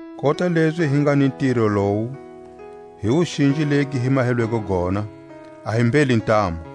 Kota lezi hi nga ni ntiro lowu, hi wuxinji legi hi mahelweko gona, a hi mbheli ntamu;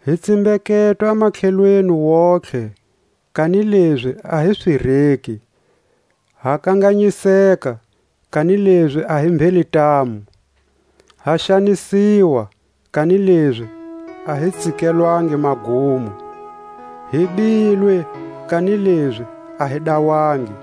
Hi tsimbeketwa matlhelweni wontihe, kanilezi a hi swireki; ha kanganyiseka, kanilezi a hi mbheli ntamu. Ha xanisiwa, kanilezi a hi tsikelwangi magumo; hi bilwe, kanilezi a hi dawangi.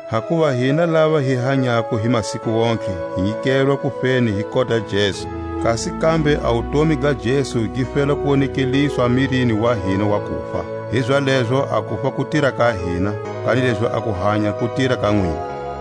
Hakuva hina lava hi hanyako hi masiku wontihe hi nyikelwa kufeni hi kota ya Jesu, kasi kambe a wutomi ga Jesu gi fela ku wonekeliswa mirini wa hina wa kufa. Hizalezo a kufa ku tira ka hina, kanilezi a kuhanya ku tira ka nwina.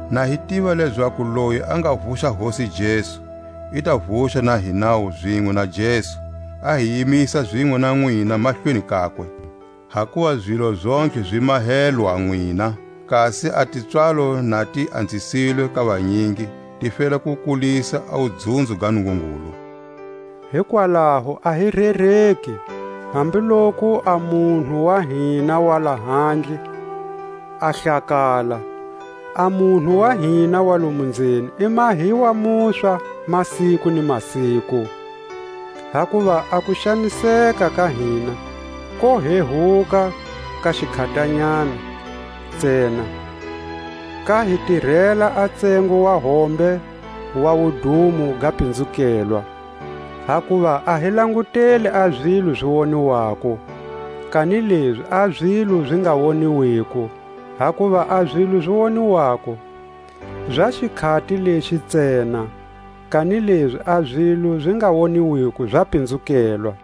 na hi tiva lezaku loyi a nga vuxa Hosi Jesu, i ta vuxa na hinawu zinwe na Jesu, a hi yimisa zinwe na nwina mahlweni kakwe. Hakuva zilo zontlhe zi mahelwa nwina, kasi a tipswalo na ti anzisilwe ka vanyingi, ti fela ku kulisa a wudzunzo ga Nungungulu. Hikwalaho a hi rereki; hambu loku a munhu wa hina wa lahandle a hlakala, a munhu wa hina wa lomu nzeni i mahiwa muswa masiku ni masiku. Hakuva a kuxaniseka ka hina ko hehuka ka xikhatanyana ntsena, ka hi tirela a ntsengo wa hombe wa wudumo ga pinzukelwa; hakuva a hi languteli a zilo zi woniwako, kanilezi a zilo zi nga woniwiko; hakuva a zilo zi woniwako za xikhati lexi ntsena, kanilezi a zilo zi nga woniwiko za kupinzukela.